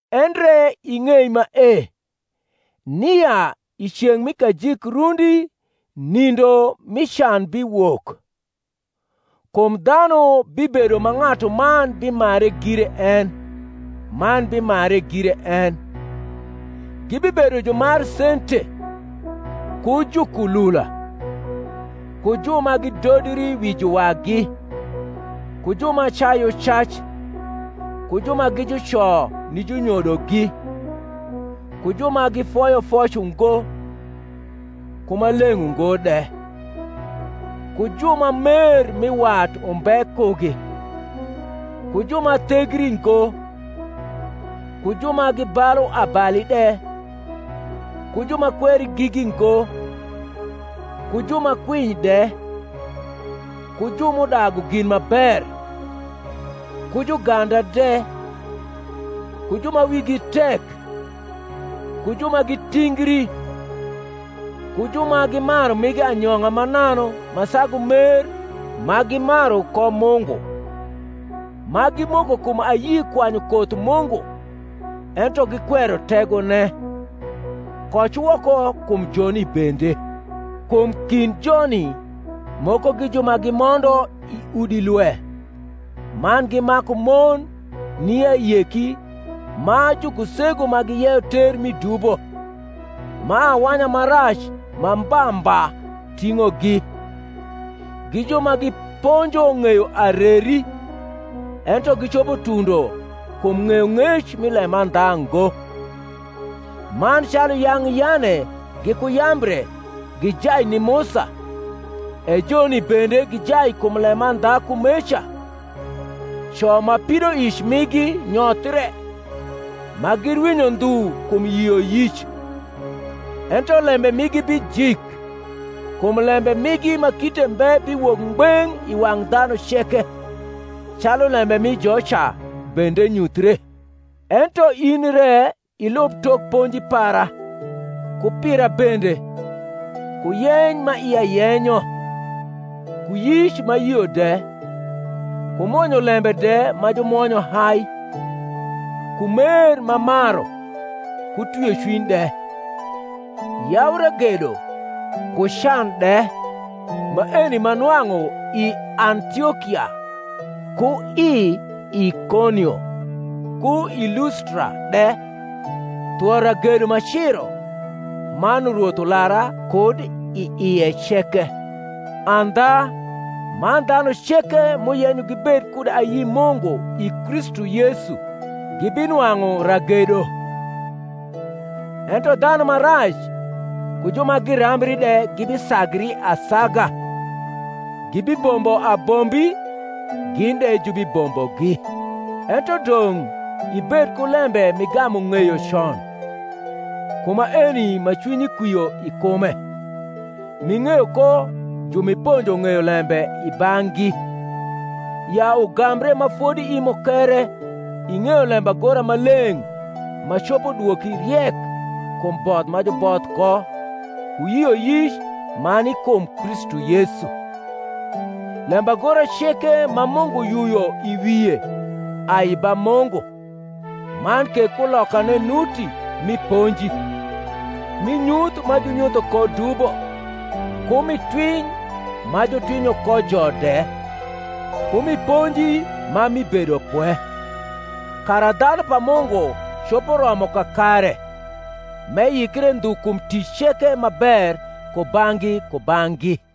Endre ing’ei mae, nia i ceng’ mi kajik rundi nindo mi can biwok. Kum dhanu bibedo ma ng’atuman bimare gire en, man bimare gire en, gibibedo jumar sente, ku jukulula, ku ju ma gidodri wi juwagi, ku ju ma cayu cac, ku ju ma gi juco ni junyodogi, ku ju ma gifoyo foc ungo, ku ma leng’ ungo de, ku ju ma mer mi wat umbe kugi, ku ju ma thegri ngo, ku ju ma gibalu abali de, ku ju ma kweri gigi ngo, ku ju ma kwiny de, ku ju m’udagu gin ma ber, ku juganda de, ku ju ma wigi tek, ku ju ma gitingri, ku ju ma gimaru migi anyong’a mananu ma sagu mer ma gimaru ko Mungu; ma gimoko kum ayi kwanyu koth Mungu, ento gikwero tegone: koc woko kum joni bende. Kum kind joni moko gi ju ma gimondo i udi lwe, man gimaku mon ni ayeki ma jukusegu ma giyeyo ter mi dubo, ma awanya ma rac ma mba mba ting’ogi, gi ju ma giponjo ng’eyo areri, ento gicopo tundo kum ng’eyong’ec mi lemandha ngo. Man calu yang’ Yane giku Yambre gijai ni Musa, e joni bende gijai kum lemandha kumeca; co ma pidoic migi nyothre, ma girwinyo ndhu kum yioyic. Ento lembe migi bijik: kum lembe migi ma kite mbe biwok ngbeng’ i wang’ dhanu ceke, calu lembe mi joca bende nyuthre. Ento in re ilub tok ponji para, ku pira bende, ku yeny ma ia yenyo, ku yic m’ayio de, ku mwonyo lembe de ma jumwonyo hai, ku mer m’amaru, ku twiocwiny de, yau ragedo, ku can de; maeni m’anwang’u i Antiokia, ku i Ikonio, ku i Lustra de; thwo ragedo m’aciro: man Rwoth ulara kud i ie ceke. Andha, man dhanu ceke m’uyenyo gibed kud ayi Mungu i Kristu Yesu gibinwang’u ragedo. Ento dhanu ma rac ku ju ma guambri de gibisagri asaga, gibibombo abombi gin de jubibombogi. Ento dong’ ibed ku lembe m’igamu ng’eyo con, ku maeni ma cwinyi kwio i kume, m’ing’eyo ko ju m’iponjo ng’eyo lembe i bang’gi; ya ugambre ma fodi i mukere ing’eyo lembagora ma leng’ ma copo dwoki riek kum both ma juboth ko ku yioyic ma ni kum Kristu Yesu. lembagora ceke ma Mungu yuyo i wie ai ba Mungu man ke kulokane nuti mi ponji, mi nyuth ma junyutho ko dubo, ku mi twiny ma jutwinyo kojo de, ku mi ponji ma mi bedopwe: kara dhanu pa Mungu copo romo kakare, m’eyikre ndhu kum tic ceke ma ber kubang’gi kubang’gi.